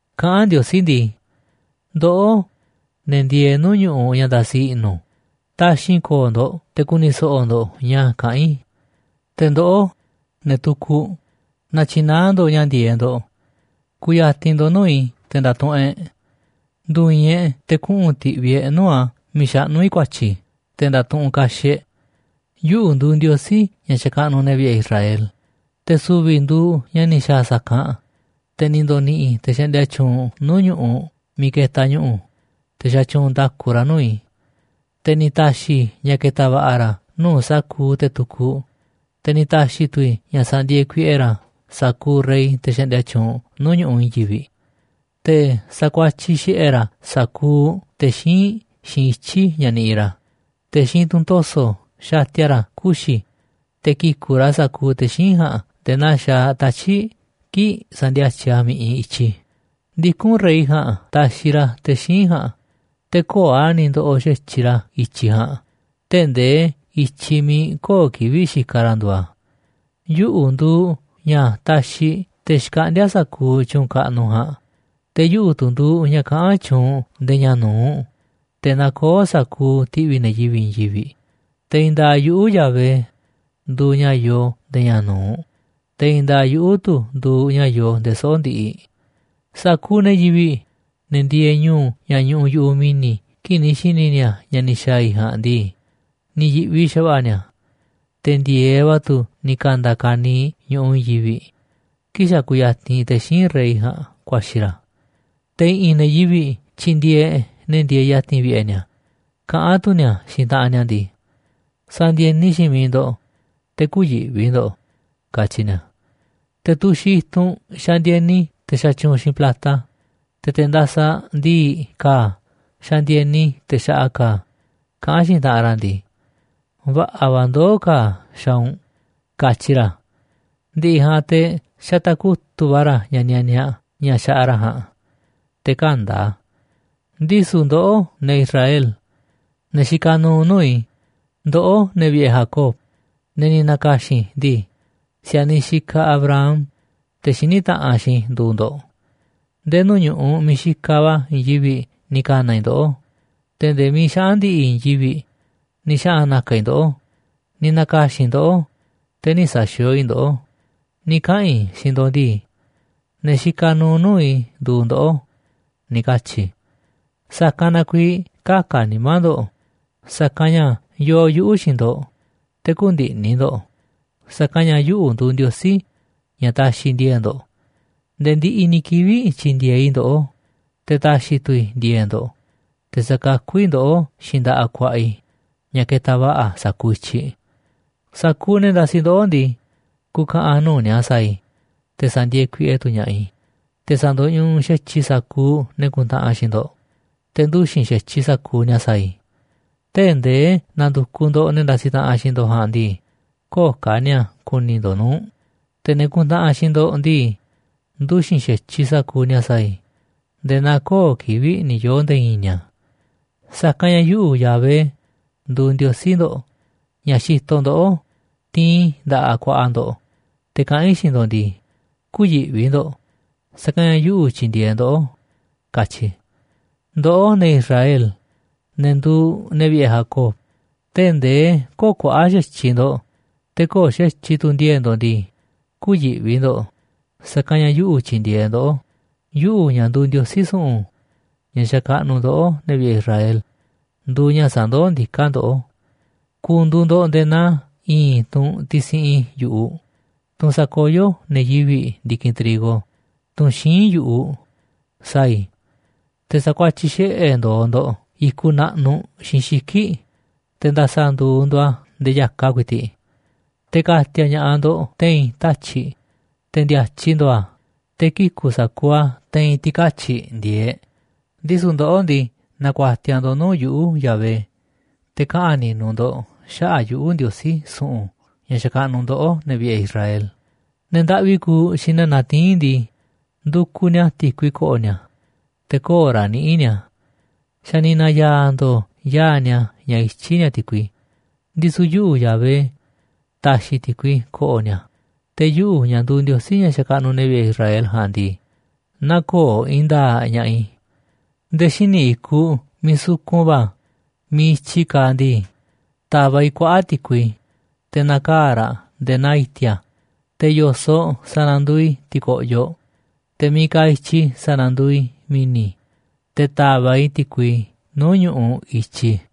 Kaꞌán Ndiosí ndii: “Ndoꞌó, ne̱ ndieeꞌ nuu̱ꞌ ñu̱ꞌuꞌ ña̱ ndasi i̱ꞌnu̱, taxi̱nꞌ ko̱o̱ ndo̱ꞌ te̱ ku̱ni̱ so̱ꞌo̱ ndo̱ꞌ ña̱ kaꞌán i̱. Te̱ ndoꞌó, ne̱ tukuꞌ, na̱tyi̱naá ndo̱ꞌ ña̱ ndi̱e̱eꞌ ndo̱ꞌ. Ku̱ya̱ti̱n ndo̱ꞌ nuu̱ꞌ i̱ te̱ nda̱tuꞌunꞌ e̱ꞌ. Ndu̱i̱i̱n e̱ꞌ te̱ kuꞌu̱n ti̱ꞌvi̱ e̱ꞌ nuu̱ꞌ a̱ miiꞌ xaꞌnú i̱ ku̱a̱tyi̱ te̱ nda̱tuꞌunꞌ kaxiꞌ e̱ꞌ. ’Yuꞌu̱ nduuꞌ Ndiosí ña̱ xakaꞌnuꞌ ne̱ vi̱ꞌe̱ Israel. Te̱ su̱vi̱ i̱ nduuꞌ ña̱ ni̱ xa̱a̱ sa̱kanꞌ te̱ ni̱ ndo̱ni̱ꞌi̱ te̱ xaꞌndia tyuunꞌ nuu̱ꞌ ñu̱ꞌuꞌ miiꞌ ketaꞌ ñu̱ꞌu̱, te̱ sa̱tyuunꞌ nda̱ku ra̱ nuu̱ꞌ i̱. Te̱ ni̱ ta̱xi̱ i̱ ña̱ ke̱ta̱ va̱ꞌa̱ ra̱ nuu̱ꞌ sa̱kuuꞌ te̱ tukuꞌ, te̱ ni̱ ta̱xi̱ tu̱ i̱ ña̱ sa̱ndi̱e̱e̱ kuiꞌe ra̱ sa̱kuuꞌ rey, te̱ xaꞌndia tyuunꞌ nuu̱ꞌ ñu̱ꞌuꞌ i̱i̱n yivi̱ꞌ. Te̱ sakuatyiꞌ xiꞌe̱ ra̱ sa̱kuuꞌ te̱ xíinꞌ xiinꞌ ityi̱ ña̱ niꞌiꞌ ra̱, te̱ xiinꞌ tunꞌ to̱so̱ xatia ra̱ kuxi̱ te̱ ki̱ku̱ꞌ ra̱ sa̱kuuꞌ te̱ xíinꞌ ja̱a̱nꞌ nde̱e̱ naa xaaꞌ tatyi̱ꞌ kii̱ꞌ sandiatyiꞌ a̱ mi̱ꞌiꞌ i̱tyi. Ndikún rey ja̱a̱nꞌ taxiꞌ ra̱ te̱ xíinꞌ ja̱a̱nꞌ, te̱ köo̱ꞌ a̱ ni̱ ndoꞌoꞌ xa̱tyiꞌ ra̱ i̱tyiꞌ ja̱a̱nꞌ tee̱ꞌ ndee i̱tyiꞌ miiꞌ köo̱ꞌ kivi̱ꞌ xikaꞌ ra̱ nduuꞌ a̱. Yuꞌu̱ nduuꞌ ña̱ taxiꞌ te̱ xkaꞌndíá sa̱kuuꞌ tyu̱u̱n kaꞌnuꞌ ja̱a̱nꞌ, te̱ yuꞌu̱ tu̱ nduuꞌ ña̱ kaꞌán tyuunꞌ nde̱e̱ ña̱ nu̱uꞌ te̱ nakoó sa̱kuuꞌ ti̱ꞌvi̱ ne̱ yivi̱ꞌ i̱i̱n yivi̱ꞌ. Te̱ i̱i̱n nda̱a̱ꞌ yuꞌu̱, Yahvé, nduuꞌ ña̱ yoo nde̱e̱ ña̱ nu̱uꞌ, te̱ i̱i̱n nda̱a̱ꞌ yuꞌu̱ tu̱ nduuꞌ ña̱ yoo nde̱e̱ soꞌo̱ꞌ ndiꞌiꞌ. ’Sa̱kuuꞌ ne̱ yivi̱ꞌ, ne̱ ndieeꞌ ñu̱u̱ ña̱ ñuꞌuꞌ yu̱ꞌuꞌ mi̱ni̱ kii̱ꞌ ni̱ xi̱ni̱ ni̱a̱ ña̱ ni̱ xa̱a̱ i̱ jaa̱nꞌ ndii, ni̱ yi̱ꞌvi xa̱va̱ꞌa̱ ni̱a̱. Te̱ ndi̱e̱eꞌ va̱ tu̱ ni̱ ka̱nda̱ kaniiꞌ ñu̱ꞌuꞌ i̱i̱n yivi̱ꞌ kii̱ꞌ xa̱ kuyatinꞌ te̱ xíinꞌ rey ja̱a̱nꞌ kuaxi̱ ra̱. Te̱ i̱ꞌi̱n ne̱ yivi̱ꞌ tyindieeꞌ ne̱ ndieeꞌ ya̱ti̱n vi̱ꞌe̱ ni̱a̱, kaꞌán tu̱ ni̱a̱ xiinꞌ taꞌanꞌ ni̱a̱ ndii: Sa̱ndi̱e̱ni xiinꞌ miiꞌ ndo̱ꞌ, te̱ kü̱yi̱ꞌvi ndo̱ꞌ, katyi ni̱a̱. Te̱ tuxiꞌ i̱tunꞌ xandieni te̱ xatyuunꞌ xiinꞌ plata, te̱ te̱ ndasaꞌ ndi̱i̱ꞌ ka̱a̱ xandieni te̱ xaꞌa ka̱a̱, kaꞌán xiinꞌ taꞌanꞌ ra̱ ndii: Va̱ꞌa̱ va̱ ndoó ka̱a̱ xaaꞌ u̱nꞌ, katyi ra̱. Ndi̱ꞌi̱ ja̱a̱nꞌ te̱ xataꞌ kutu̱ꞌ va̱ ra̱ ña̱ nianiaꞌ, ña̱ xaꞌa ra̱ ja̱a̱nꞌ, te̱ kä̱nda̱ a̱. ’Ndisu̱ ndoꞌó, ne̱ Israel, ne̱ xikaꞌ nuuꞌ nuu̱ꞌ i̱, ndoꞌó, ne̱ vi̱ꞌe̱ Jacob, ne̱ ni̱ na̱ka̱xi̱n i̱ ndii, si̱a̱niꞌ xikaꞌ Abraham, te̱ xiní taꞌanꞌ xiinꞌ i̱, nduuꞌ ndo̱ꞌ. Nde̱e̱ nuu̱ꞌ ñu̱ꞌuꞌ miiꞌ xikaꞌ va̱ i̱i̱n yivi̱ꞌ ni̱ ka̱na̱ i̱ ndoꞌó, te̱ nde̱e̱ miiꞌ xaꞌa̱n ndi̱ꞌi̱ i̱i̱n yivi̱ꞌ ni̱ xaꞌa̱n na̱ka̱ i̱ ndoꞌó, ni̱ na̱ka̱xi̱n i̱ ndoꞌó, te̱ nï̱ sa̱xi̱o̱o̱ i̱ ndoꞌó, ni̱ kaꞌa̱n i̱ xiinꞌ ndo̱ꞌ ndii: Ne̱ xikaꞌ nuuꞌ nuu̱ꞌ i̱ nduuꞌ ndoꞌó, ni̱ katyi̱ i̱. Sa̱kanꞌ na kuiiꞌ kä̱ka̱ nimá ndo̱ꞌ, sa̱kanꞌ ña̱ yoo yuꞌu̱ xiinꞌ ndo̱ꞌ, te̱ kü̱ndi̱ꞌni̱ ndo̱ꞌ, sa̱kanꞌ ña̱ yuꞌu̱ nduuꞌ Ndiosí ña̱ taxiꞌ ndi̱e̱e̱ꞌ ndo̱ꞌ. Nde̱e̱ ndiꞌiꞌ ni̱ kivi̱ꞌ tyi̱ndi̱e̱eꞌ i̱ ndoꞌó, te̱ ta̱xi̱ tu̱ i̱ ndi̱e̱e̱ꞌ ndo̱ꞌ, te̱ sa̱kakú i̱ ndoꞌó xiinꞌ nda̱ꞌaꞌ ku̱a̱ꞌa̱ i̱ ña̱ ketaꞌ va̱ꞌa̱ sa̱kuuꞌ i̱tyiꞌ. ’Sa̱kuuꞌ ne̱ ndasiꞌ ndoꞌó ndii, ku̱ka̱ꞌa̱n nuu̱ꞌ ni̱a̱ sa̱a̱ i̱, te̱ sa̱ndi̱e̱e̱ kuiꞌe tu̱ ña̱ꞌaꞌ i̱, te̱ sa̱ndo̱ñuꞌuꞌ xa̱tyiꞌ i̱ sa̱kuuꞌ ne̱ kuntaꞌanꞌ xiinꞌ ndo̱ꞌ, te̱ nduxi̱n xa̱tyiꞌ sa̱kuuꞌ ni̱a̱ sa̱a̱ i̱. Tee̱ꞌ ndee na̱ndu̱kuꞌ ndo̱ꞌ ne̱ ndasiꞌ taꞌanꞌ xiinꞌ ndo̱ꞌ ja̱a̱nꞌ ndii, köo̱ꞌ ka̱ ni̱a̱ ku̱ni̱ ndo̱ꞌ nuu̱ꞌ. Te̱ ne̱ kuntaꞌanꞌ xiinꞌ ndo̱ꞌ ndii, nduxi̱n xa̱tyiꞌ sa̱kuuꞌ ni̱a̱ sa̱a̱ i̱ nde̱e̱ naa köo̱ꞌ kivi̱ꞌ ni̱ yoo̱ nde̱e̱ i̱i̱n ni̱a̱. Sa̱kanꞌ ña̱ yuꞌu̱, Yahvé, nduuꞌ Ndiosí ndo̱ꞌ, ña̱ xitoꞌ ndoꞌó tiinꞌ i̱ nda̱ꞌaꞌ ku̱a̱ꞌa̱ ndo̱ꞌ, te̱ kaꞌán i̱ xiinꞌ ndo̱ꞌ ndii: Kü̱yi̱ꞌvi ndo̱ꞌ, sa̱kanꞌ ña̱ yuꞌu̱ tyindieeꞌ ndoꞌó, katyi i̱. ’Ndoꞌó, ne̱ Israel, ne̱ nduuꞌ ne̱ vi̱ꞌe̱ Jacob, tee̱ꞌ ndee köo̱ꞌ kuaꞌa̱ꞌ xa̱tyiꞌ ndo̱ꞌ, te̱ köo̱ꞌ xa̱tyiꞌ tu̱ ndi̱e̱e̱ꞌ ndo̱ꞌ ndii, kü̱yi̱ꞌvi ndo̱ꞌ, sa̱kanꞌ ña̱ yuꞌu̱ tyindieeꞌ ndoꞌó. Yuꞌu̱, ña̱ nduuꞌ Ndiosí su̱ꞌu̱n, ña̱ xakaꞌnuꞌ ndoꞌó, ne̱ vi̱ꞌe̱ Israel, nduuꞌ ña̱ sandoó ndiká ndoꞌó. Ku̱ndu̱u̱ ndo̱ꞌ nde̱e̱ naa i̱i̱n tunꞌ tisiꞌin yu̱ꞌuꞌ, tunꞌ sakoyó ne̱ yivi̱ꞌ ndi̱kinꞌ trigo, tunꞌ xíinꞌ yu̱ꞌuꞌ, sa̱a̱ i̱, te̱ sakuatyiꞌ xiꞌe̱ ndo̱o̱ ndo̱ꞌ i̱kuꞌ naꞌnuꞌ xiinꞌ xiki̱ꞌ, te̱ nda̱sa̱ nduuꞌ ndo̱ꞌ a̱ ndee ya̱kaꞌ ku̱i̱ti̱ꞌ. Te̱ ka̱ti̱a̱ ña̱ꞌaꞌ ndo̱ꞌ te̱i̱n tatyi̱ꞌ te̱ ndi̱a̱tyiꞌ ndo̱o̱ a̱, te̱ kiku̱ sa̱kuuꞌ a̱ te̱i̱n ti̱katyi̱ꞌ ndi̱e̱eꞌ. Ndisu̱ ndoꞌó ndii, na̱ku̱a̱tiaꞌ ndo̱ꞌ nuu̱ꞌ yuꞌu̱, Yahvé, te̱ kaꞌa̱n ni̱nu̱ ndo̱ꞌ xaꞌa̱ꞌ yuꞌu̱, Ndiosí su̱ꞌu̱n ña̱ xakaꞌnuꞌ ndoꞌó, ne̱ vi̱ꞌe̱ Israel. ’Ne̱ ndaꞌvi kuuꞌ xiinꞌ ne̱ natiín ndii, ndukuꞌ ni̱a̱ ti̱kui ko̱ꞌo̱ ni̱a̱, te̱ köo̱ꞌ raꞌ niꞌíꞌ ni̱a̱. Xa̱ ni̱ na̱ya̱a̱ ndo̱o̱ yaa̱ꞌ ni̱a̱ ña̱ ityí ni̱a̱ ti̱kui. Ndisu̱ yuꞌu̱, Yahvé, ta̱xi̱ ti̱kui ko̱ꞌo̱ ni̱a̱, te̱ yuꞌu̱, ña̱ nduuꞌ Ndiosí ña̱ xakaꞌnuꞌ ne̱ vi̱ꞌe̱ Israel ja̱a̱nꞌ ndii, nä̱ko̱o̱ i̱i̱n nda̱a̱ꞌ ña̱ꞌaꞌ i̱. Nde̱e̱ xíniꞌ i̱kuꞌ miiꞌ sukun va̱ miiꞌ i̱tyiꞌ kaaꞌ ndii, ta̱va̱ꞌ i̱ kuaꞌa̱ꞌ ti̱kui, te̱ na̱kaa̱ꞌ raꞌ nde̱e̱ naa i̱ti̱a̱, te̱ yo̱soꞌ sa̱na̱nduuꞌ i̱ ti̱ko̱ꞌyoꞌ, te̱ miiꞌ kaaꞌ i̱tyi sa̱na̱nduuꞌ i̱ mi̱ni̱, te̱ ta̱va̱ꞌ i̱ ti̱kui nuu̱ꞌ ñu̱ꞌuꞌ i̱tyiꞌ.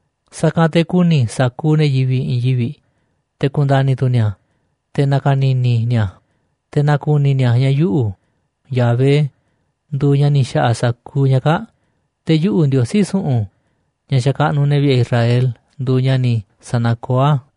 Sa̱kanꞌ te̱ ku̱ni̱ sa̱kuuꞌ ne̱ yivi̱ꞌ i̱i̱n yivi̱ꞌ, te̱ ku̱nda̱ni̱ tu̱ ni̱a̱, te̱ na̱ka̱ni̱ni̱ ni̱a̱, te̱ na̱ku̱ni̱ ni̱a̱ ña̱ yuꞌu̱, Yahvé, nduuꞌ ña̱ ni̱ xa̱ꞌa̱ sa̱kuuꞌ ña̱ kaa̱ꞌ, te̱ yuꞌu̱ Ndiosí su̱ꞌu̱n, ña̱ xakaꞌnuꞌ ne̱ vi̱ꞌe̱ Israel, nduuꞌ ña̱ ni̱ sa̱nakoó a̱.”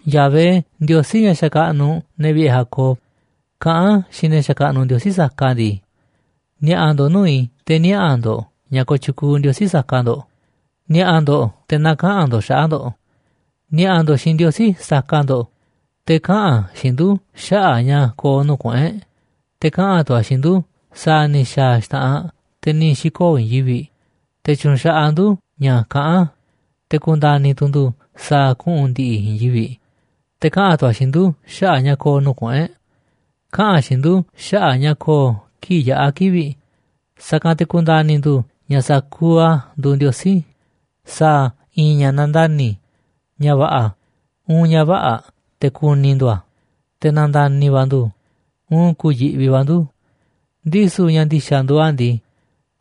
Yahvé, Ndiosí ña̱ xakaꞌnuꞌ ne̱ vi̱ꞌe̱ Jacob, kaꞌán xiinꞌ ne̱ xakaꞌnuꞌ ndiosí saka ndii: “Ni̱a̱ꞌa̱ ndo̱ꞌ nuu̱ꞌ i̱ te̱ niaꞌa̱ ndo̱ꞌ ña̱ kooꞌ tyukuuꞌ ndiosí saka ndo̱ꞌ, ni̱a̱ꞌa̱ ndo̱ꞌ te̱ na̱kaꞌa̱n ndo̱ꞌ xaꞌa̱ꞌ ndo̱ꞌ. Ni̱a̱ꞌa̱ ndo̱ꞌ xiinꞌ ndiosí saka ndo̱ꞌ, te̱ kaꞌa̱n a̱ xiinꞌ ndu̱ xaꞌa̱ꞌ ña̱ ko̱o̱ nuu̱ꞌ kuꞌu̱n e̱ꞌ, te̱ kaꞌa̱n tu̱ a̱ xiinꞌ ndu̱ sa̱a̱ ni̱ xa̱a̱ xta̱ꞌanꞌ te̱ ni̱ xi̱koo̱ i̱i̱n yivi̱ꞌ. Te̱ tyu̱nxaꞌaꞌ ndu̱ ña̱ kaꞌán a̱, te̱ ku̱nda̱ni̱ tu̱ ndu̱ sa̱a̱ kuꞌu̱n ndi̱ꞌi̱ i̱i̱n yivi̱ꞌ. Te̱ kaꞌa̱n tu̱ a̱ xiinꞌ ndu̱ xaꞌa̱ꞌ ña̱ ko̱o̱ nuu̱ꞌ kuꞌu̱n e̱ꞌ. Kaꞌa̱n a̱ xiinꞌ ndu̱ xaꞌa̱ꞌ ña̱ ko̱o̱ kii̱ꞌ yaꞌa̱ kivi̱ꞌ, sa̱kanꞌ te̱ ku̱nda̱ni̱ ndu̱ꞌ ña̱ sa̱kuuꞌ a̱ nduuꞌ ndiosí. Sa̱a̱ a̱ i̱i̱n ña̱ na̱nda̱ni̱, ña̱ va̱ꞌa̱ uun ña̱ vä̱ꞌa̱ te̱ ku̱ni̱ ndu̱ a̱, te̱ na̱nda̱ni̱ va̱ ndu̱ uun ku̱yi̱ꞌvi va̱ ndu̱. Ndisu̱ ña̱ ndi̱xa̱ nduuꞌ a̱ ndii,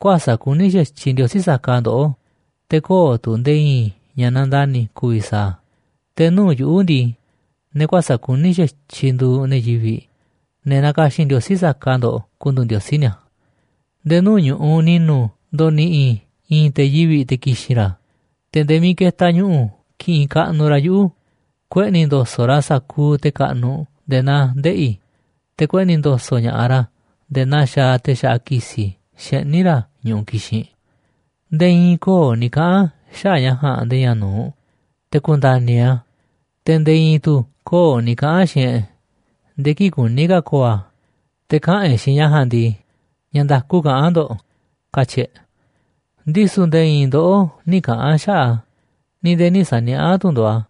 kuäsa̱ꞌ kuní xa̱tyiꞌ ndiosí saka ndoꞌó, te̱ köo̱ꞌ tu̱ nde̱e̱ i̱i̱n ña̱ nandani̱ ku̱vi̱ sa̱a̱ a̱. Te̱ nuu̱ꞌ yuꞌu̱ ndii, ne̱ kuäsa̱ꞌ kuní xa̱tyiꞌ nduuꞌ ne̱ yivi̱ꞌ, ne̱ nakaxin ndiosí saka ndoꞌ kunduuꞌ ndiosí ni̱a̱. ’Nde̱e̱ nuu̱ꞌ ñu̱ꞌuꞌ ni̱nu̱ ndo̱ni̱ꞌi̱ i̱ i̱i̱n te̱ yivi̱ꞌ te̱ ki̱xi̱n ra̱, te̱ nde̱e̱ miiꞌ ketaꞌ ñu̱ꞌu̱ ki̱ꞌi̱n kaꞌnuꞌ ra̱ yuꞌu̱. Kueꞌni̱ ndo̱so̱ꞌ ra̱ sa̱kuuꞌ te̱ kaꞌnuꞌ nde̱e̱ naa ndeꞌi̱, te̱ kueꞌni̱ ndo̱so̱ꞌ ña̱ꞌaꞌ ra̱ nde̱e̱ naa xaaꞌ te̱ xaꞌa ki̱si̱ xeꞌní ra̱ ñu̱ꞌuꞌ kixinꞌ. Nde̱e̱ i̱i̱n köo̱ꞌ ni̱ kaꞌa̱n xaꞌa̱ꞌ ña̱ ja̱a̱nꞌ nde̱e̱ ña̱ nu̱uꞌ, te̱ ku̱nda̱ni̱ e̱ꞌ a̱. Te̱ nde̱e̱ i̱i̱n tu̱ köo̱ꞌ ni̱ kaꞌa̱n xiinꞌ e̱ꞌ nde̱e̱ kii̱ꞌ kuní ka̱ ko̱o̱ a̱, te̱ kaꞌa̱n e̱ꞌ xiinꞌ ña̱ ja̱a̱nꞌ ndii: Ña̱ nda̱ku kaꞌán ndo̱ꞌ, katyi̱ e̱ꞌ. ’Ndisu̱ nde̱e̱ i̱i̱n ndoꞌó nï̱ kaꞌa̱n xaꞌa̱ꞌ a̱, ni̱ nde̱e̱ nï̱ sa̱niaꞌá tu̱ ndo̱ꞌ a̱,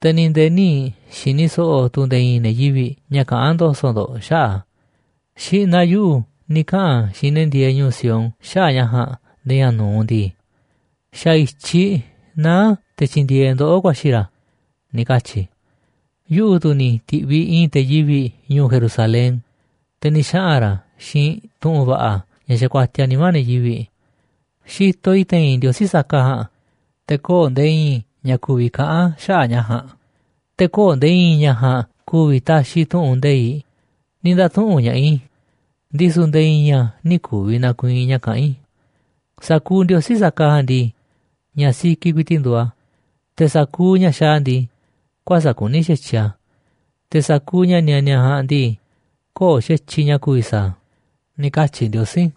te̱ ni̱ nde̱e̱ nï̱ xi̱ni̱ so̱ꞌo̱ tu̱ nde̱e̱ i̱i̱n ne̱ yivi̱ꞌ ña̱ kaꞌán ndo̱so̱ꞌ ndo̱ꞌ xaꞌa̱ꞌ a̱. Xi̱ꞌna̱ yuꞌu̱ ni̱ kaꞌa̱n xiinꞌ ne̱ ndieeꞌ ñu̱u̱ Sión xaꞌa̱ꞌ ña̱ ja̱a̱nꞌ nde̱e̱ ña̱ nu̱uꞌ ndii: Xa̱ i̱tyiꞌ naá te̱ tyi̱ndi̱e̱eꞌ ndoꞌó ku̱a̱xi̱ ra̱, ni̱ katyi̱ i̱. Yuꞌu̱ tu̱ ni̱ ti̱ꞌviꞌ i̱i̱n te̱ yivi̱ꞌ ñu̱u̱ Jerusalén, te̱ ni̱ xaꞌa̱n ra̱ xiinꞌ tu̱ꞌu̱n va̱ꞌa̱ ña̱ xakuatiaꞌ nimá ne̱ yivi̱ꞌ. Xitoꞌ i̱ te̱i̱n ndiosí saka ja̱a̱nꞌ, te̱ köo̱ꞌ nde̱e̱ i̱i̱n ña̱ ku̱vi̱ kaꞌán xaꞌa̱ꞌ ña̱ ja̱a̱nꞌ, te̱ köo̱ꞌ nde̱e̱ i̱i̱n ña̱ ja̱a̱nꞌ ku̱vi̱ taxiꞌ tu̱ꞌu̱n nde̱iꞌ, ni̱ nda̱tuꞌu̱nꞌ ña̱ꞌaꞌ i̱, ndisu̱ nde̱e̱ i̱i̱n a̱ nï̱ ku̱vi̱ na̱ku̱i̱i̱n ña̱ kaꞌán i̱. Sa̱kuuꞌ ndiosí saka ja̱a̱nꞌ ndii, ña̱ sikiꞌ ku̱i̱ti̱ꞌ nduuꞌ a̱, te̱ sa̱kuuꞌ ña̱ xaaꞌ a̱ ndii, kuäsa̱ꞌ kuní xa̱tyiꞌ a̱. Te̱ sa̱kuuꞌ ña̱ nianiaꞌ ja̱a̱nꞌ ndii, köo̱ꞌ xa̱tyiꞌ ña̱ ku̱vi̱ sa̱a̱ a̱”, ni̱ katyi̱ Ndiosí.